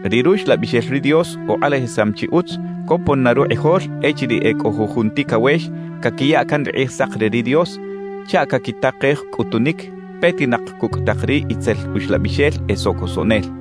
Ri Ruxlabixel ri Dios ukꞌalajisam chi utz copon na rukꞌijol echiriꞌ e cꞌo jujun ticawex caquiya can ri Kꞌijsak re ri Dios chaꞌ caquitakej cꞌutunic petinak cucꞌ tak ri itzel uxlabixel e socosoꞌnel.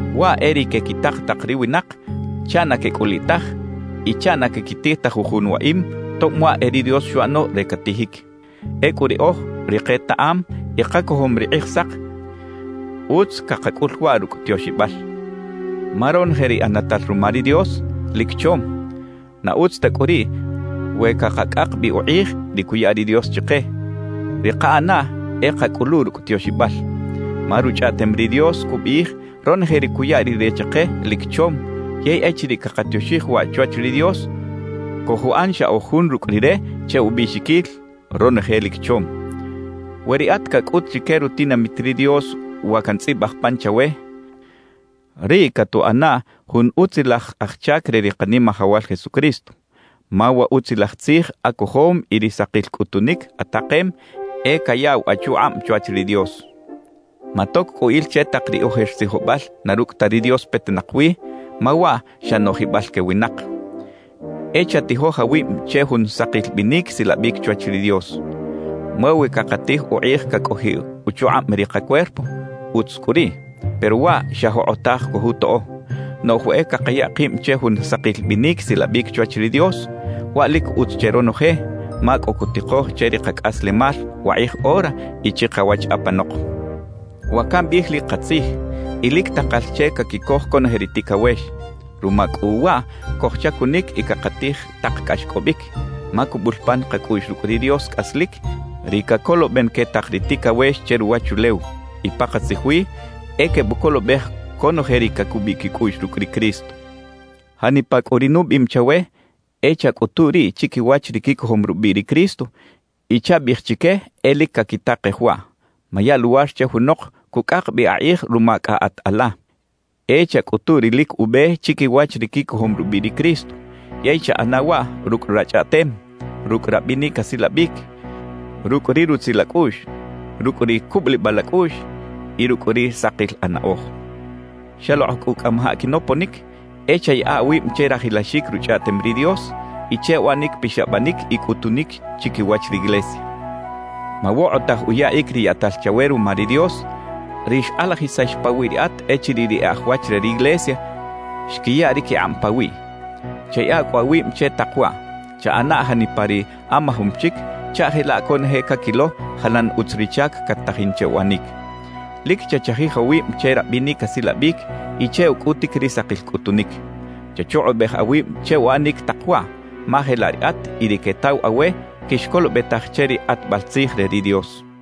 Waꞌ e ri quequitak tak ri winak chaꞌ na quecꞌuliꞌ taj y chaꞌ na caquitij ta jujun waꞌim tob waꞌ e ri Dios xuꞌano re catijic; ecꞌu riꞌoj, ri ketaꞌam y kacojom ri Kꞌijsak, utz cakacꞌul waꞌ rucꞌ tioxibal. Ma ronoje ri ꞌanatal ruma ri Dios, lic chom; na utz ta cꞌu riꞌ we cakacꞌak bi ukꞌij ri cuya ri Dios chike. Ri kaꞌanaꞌ e kacꞌulu rucꞌ tioxibal. Ma Ruchꞌaꞌtem ri Dios cubiꞌij ronoje ri cuya Rire chike lic chom; yey echiriꞌ cakatioxij waꞌ chwach ri Dios, cojuꞌan xa oj jun rucꞌ Rire che ubiꞌxiquil: Ronoje lic chom. We riꞌat cacꞌut chique rutinamit ri Dios wa cantzꞌibaj pan chawe, riꞌ catuꞌana jun utzilaj aj chac re ri Kanimajawal Jesucristo; ma wa Utzilaj Tzij acojom y ri sakil cꞌutunic atakem e cayaꞌw achukꞌab chwach ri Dios. Matoc cꞌu il che tak ri ojer tzijobal na rucꞌ ta ri Dios petinak wi, ma waꞌ xa noꞌjibal que winak. E chatijoj awib che jun sakil binic silabic chwach ri Dios. Ma we cakatij ukꞌij cacꞌojiꞌ uchukꞌab ri kacuerpo, utz cꞌu riꞌ; pero waꞌ xa jokꞌotaj cojutoꞌo. Noꞌj we e cakaya kib che jun sakil binic silabic chwach ri Dios, waꞌ lic utz che ronoje, ma cꞌo cutikoj che ri kacꞌaslemal wakꞌij ora y chikawach apanok. Wa cambiꞌij lic katzij y lic takal che caquicoj conoje ri ticawex. Ruma cꞌu waꞌ cojchacunic y cakatij tak cꞌaxcꞌobic, ma cubul pan kacꞌuꞌx rucꞌ ri Dios cꞌaslic, ri cacoloben que tak ri ticawex che ruwachulew; y pakatzij wi, e quebucolobej conoje ri cacubiꞌ quicꞌuꞌx rucꞌ ri Cristo. Janipa cꞌu ri nubiꞌim chawe, e chacꞌutu riꞌ chiquiwach ri quicojom rubiꞌ ri Cristo y chabiꞌij chique e lic caquitakej waꞌ. Maya luwar che junok cucꞌak bi akꞌij ruma cꞌa at ala. E chacꞌutu ri lic ube chiquiwach ri quicojom rubiꞌ ri Cristo, yey chaꞌana waꞌ rucꞌ rachꞌaꞌtem, rucꞌ rabinic asilabic, rucꞌ ri rutzil acꞌuꞌx, rucꞌ ri cubulibal acꞌuꞌx y rucꞌ ri sakil anaꞌoj. Xalokꞌ cꞌu cꞌamajaꞌ quinoponic, e chayaꞌa awib che rajilaxic Ruchꞌaꞌtem ri Dios y che uꞌanic pixabanic y cꞌutunic chiquiwach riglesia. Mawokꞌotaj uyaꞌic ri yaꞌtal chawe ruma ri Dios, ri xkꞌalajisax pawiꞌ riꞌat echiriꞌ ri e aj wach re riglesia xquiya ri quikꞌab pawiꞌ. Chayaꞌa cꞌu awib che tak waꞌ: Chaꞌana janipa ri amajom chic chaꞌ jelaꞌ conoje caquilo jalan utz ri chac cat-tajin che uꞌanic. Lic chachajij awib che rabinic asilabic y che ucꞌutic ri sakil cꞌutunic. Chachukꞌubej awib che uꞌanic tak waꞌ, ma jelaꞌ riꞌat y ri quetaw awe quixcolobetaj che ri kꞌatbal tzij re ri Dios.